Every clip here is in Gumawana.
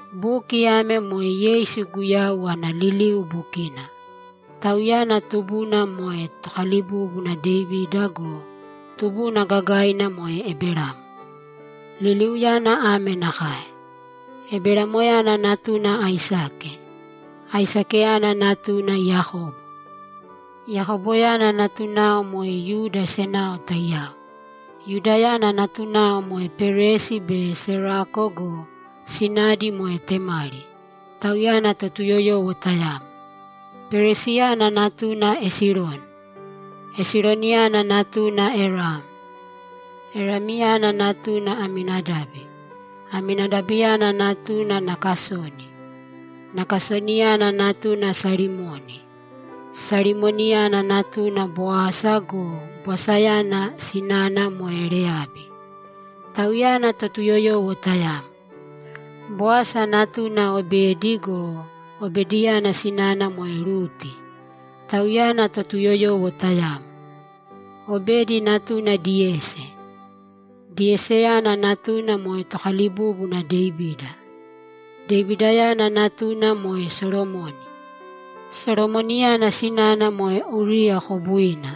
Buki ame moe Yeisu Guyau ana liliu bukina. Tauyana tubuna moe tokalibúbuna Devida go, tubuna gagaina moe Eberamo. Liliuyana ame nakae: Eberamoyana natuna Aisake. Aisakeyana natuna Yakobo. Yakoboyana natunao moe Yuda senao taiyao. Yudayana natunao moe Peresi be Serako go, sinadi moe Temari; tauyana Totuyoyowo tayamo. Peresiyana natuna Esironi. Esironiyana natuna Eram. Eramyana natuna Aminadabi. Aminadabiyana natuna Nakasoni. Nakasoniyana natuna Salimoni. Salimoniyana natuna Boasa go, Boasayana sinana moe Reyabi; tauyana Totuyoyowo tayamo. Boasa natuna Obedi go, Obediyana sinana moe Ruti; tauyana Totuyoyowo tayamo. Obedi natuna Diyesi. Diyesiyana natuna moe tokalibúbuna Devida. Devidayana natuna moe Solomoni. Solomoniyana sinana moe Uriya kobuina.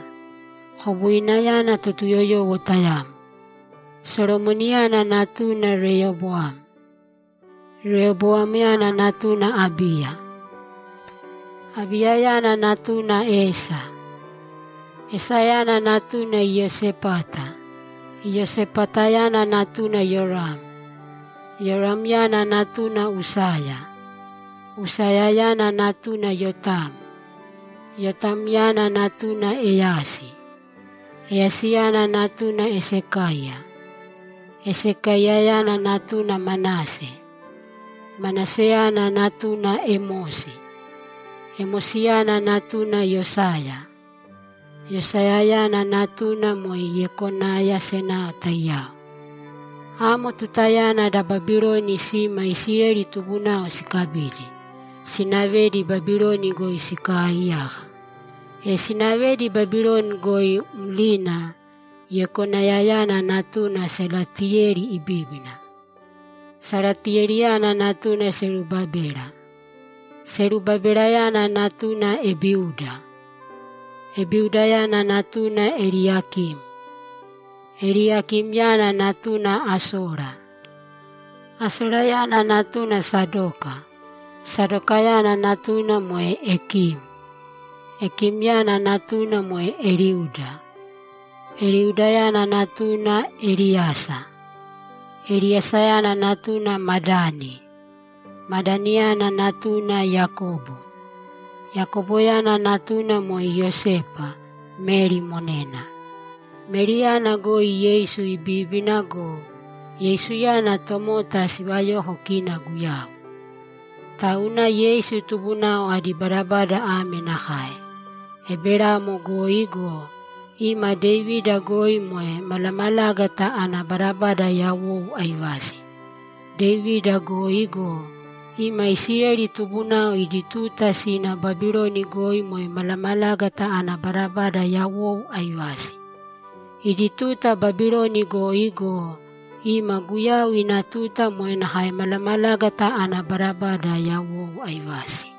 Kobuinayana Totuyoyowo tayamo. Solomoniyana natuna Reyoboam. Reyoboamyana natuna Abiya. Abiyayana natuna Asepi. Asepiyana natuna Iyosepata. Iyosepatayana natuna Yoram. Yoramyana natuna Usaya. Usayayana natuna Yotam. Yotamyana natuna Eyasi. Eyasiyana natuna Esakaiya. Esakaiyayana natuna Manase. Manaseyana natuna Emosi. Emosiyana natuna Yosaya. Yosayayana natunao moe Yekonaya senao taiyao. Amo tutayana da Babiloni sima Isileli tubunao sikabidi, sinavedi Babiloni goi sikaaiyaka. E sinavedi Babiloni goi mlina: Yekonayayana natuna Salatiyeli ibíbina. Salatiyeliyana natuna Serubabela. Serubabelayana natuna Ebiuda. Ebiudayana natuna Eliyakim. Eliyakimyana natuna Asora. Asorayana natuna Sadoka. Sadokayana natuna moe Ekim. Ekimyana natuna moe Eliuda. Eliudayana natuna Eliyasa. Eliyasayana natuna Madani. Madaniyana natuna Yakobo. Yakoboyana natuna moe Iyosepa, Meri monena. Meriyana goi Yeisu ibíbina go, Yeisuyana tomota sivayoko kina Guyau. Tauna Yeisu tubunao adi badabada ame nakae: Eberamo goi go, ima Devida goi moe malamalágata ana badabada yawou aivasi. Devida goi go, ima Isileli tubunao idi tuta sina Babiloni goi moe malamalágata ana badabada yawou aivasi. Idi tuta Babiloni goi go, ima Guyau ina tuta moe nakae malamalágata ana badabada yawou aivasi.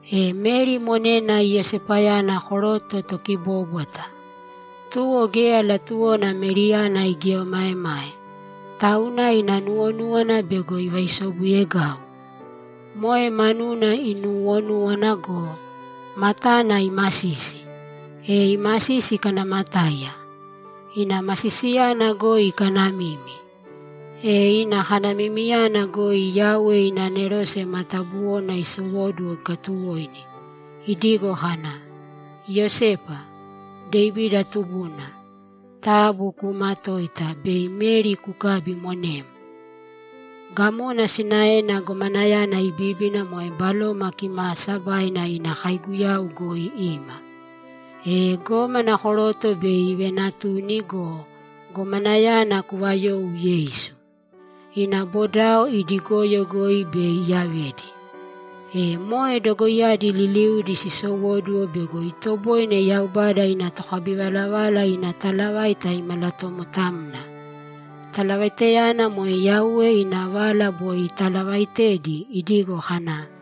E Meri monena Iyosepayana koroto tokibóbwata. Tuwo geya latuwona Meriyana igieomaemae, tauna ina nuwonúwana bego ivaisobuyegau. Moe manuna inuuwonúwana go, matana imasisi, e imasisi ikanamatáiya. Ina masisiyana goi ikanamimi. E ina kanamimiyana goi Yauwe ina anerose matabuwona isowóduwo ikatuwoini, idigo kana, ‘Iyosepa, Devida tubuna, taabu kuumatōita bei Meri kukabi monem. Gamona sinaena gomanayana ibibíbina moe Baloma Kimaasabaina ina kaiguyau goi ima. E gómana koroto bei ivenatuni go, gomanayana kuvayou Yeisu. Ina bodao idi goyo goi bei iyavedi.’ E moe dogoiyadi liliudi sisowóduwo bego itoboine Yaubada ina tokabivalavala ina talavaita imalatomotamna. Talavaitayana moe Yauwe ina vala boi italavaitedi idigo kana,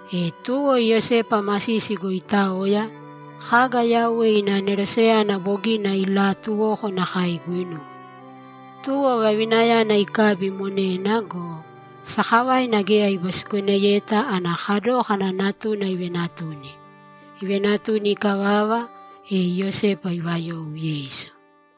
E tuwo Iyosepa masisi goi itaoya, kaga Yauwe ina aneroseyana bogina ilaatuwoko nakae iguinuwe. Tuwo vavinayana ikabi monena go, sakavaina geya ibisikoneyeta ana kadókana natuna ivenatuni. Ivenatuni ikavava, e Iyosepa ivayou Yeisu.